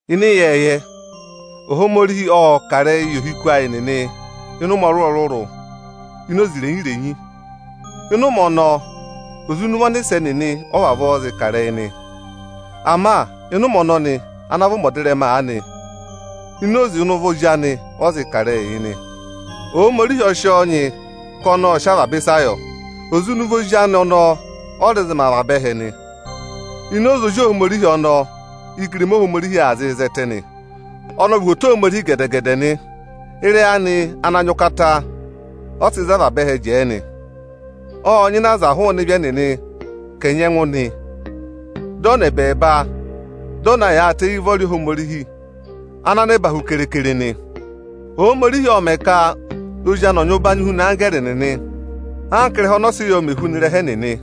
Ịnị ịyẹẹyẹ, Ohomorihi ộ kà ịrẹyị yị ohiku ayị nịnị ịnị ụmẹ ọrụrụ-ọrụrụ ini oze irenyi-renyi. Ịnị ụmẹ ọnọọ, oze ịnị ụvọ ọnịsẹ nịnị ọ vavọọ zịị kà ịrẹyị nị. Ama ịnị ụmẹ ọnọnị ana vị ụmẹ ọdịrẹma aanị, oze ịnị ụvọ Ozi anị ọ zị kà ịrẹyịị yị nị. Ohomorihi ọ sị ọọ nyị ka ọnị ọ̀ sị avaba ịsa yọ. Oze ịnị ụvọ Ozi anị ọnọọ ọ rẹ zị mẹ avaba ẹhẹ nị. Ini oze Ozi Ohomorihi ọnọọ ígirima Ohomorihi aa zịị zẹtẹ nị. Ọnị ọ vị uhwoto Ohomorihi gẹdẹ-gẹdẹ nị. Ịrẹyị anị ana nyị ụkata ọ sị za avaba ẹhẹ jẹẹ nị. Ộ nyịna aza hụụnị ịvị ẹnịnị ka ẹ̀ nyẹngụ nị. Dị ọ nọ ẹbẹẹba, dị ọ na yaayịtẹ éyi ụvọrị Ohomorihi ana nẹba hu kere-kere nị. Ohomorihi ộ mẹ̀ ka Ozi anị ọ̀ nyị ụbanyị huna anggẹẹrị nịnị anka ị́rẹha ọnị ọ sị yọ mè huna ịrẹha ẹnịnị.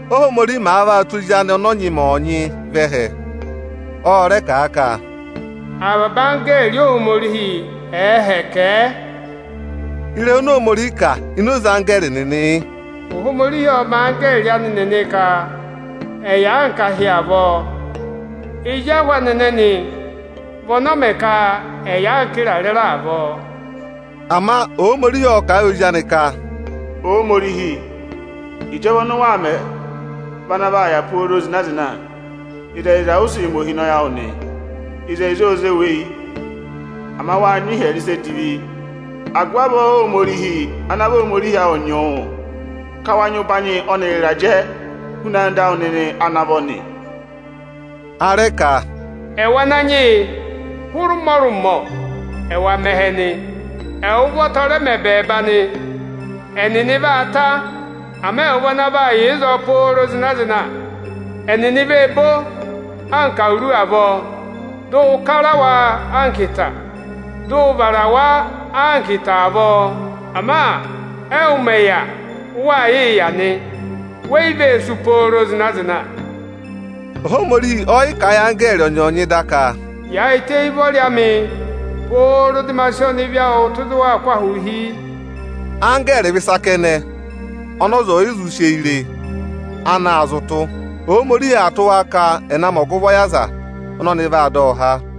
Óhomorihi màa vaa tụ́ Ozi anị ọnị ọ nyị mẹ ọọnyị vẹ ẹhẹ, ọ rẹ kà a ka, “Avaba anggẹẹrị Ohomorihi nịnị ẹẹ hẹkẹ ẹ.” Ịrẹyị oni Ohomorihi kà ini oze anggẹẹrị nịnị yị: “Ohomorihi ọ́ọ mẹ anggẹẹrị anị nịnị ka ẹ̀ yà anka ahị avọọ; ezi ahụ anị ẹnẹnị vị ọnị ọ mẹ ka ẹ̀ yà anka ịrarẹ ịra avọọ.” Ama Ohomorihi ộ kà a yị Ozi anị ka, “Ohomorihi, ịjọva ọnị ụ waa mẹ vị ana vaa yà pooro zịna-zịna. Ịzẹyịza ụ vaa sị mẹ ohinọyị awụ nị. Ịzẹyịza óo zé wu eyi, ama wáa nyị ịhyẹrẹ ịsa edivi; agụvị avọọ Óhomorihi ana vị Ohomorihi awụ nyị wụ, ka ẹwà nyị ụbanyị ọnịrị ịrajẹ huna anda awụ nịnị ana vọ nị.” A rẹ ka, “Ẹwụ Ananyị yị, hụrẹ ụmọrụmọ, ẹ́wa mẹ ẹhẹ nị. Ẹwụ ụvọta ọ rẹ mẹ ẹbẹẹba nị. Ẹnịnị vaa ta, ama ẹwụ vị ana aa yà ịzọọ pooro zịna-zịna. Ẹnịnị vee bo anka awuru avọọ, dị ụ kara wa anka ịta, dị ụ vara wa anka ịta avọọ. Ama ẹwụ mẹ̀ yà, ụ waa yịị yà nị, we yi vee sú pooro zịna-zịna!” Ohomorihi ọọ̀ yị kà a yị anggẹẹrị ọnyọọnyị da ka, “Yaayịtẹ éyi ụvọrị amị, pooro dị ma sị ọnịvị awụ tụ́ ịzị ụ waa kụ́ ahụụ hi!” Anggẹẹrị nịnị vị ịsị ọza ẹ yị zụ re, ana aa zị ụtụ yị Ohomorihi. Ẹnịnị ọọ tụ́ ka ẹ̀ na mẹ ọgụvọ yị aza ọnị ọnị vaa dọ há nị.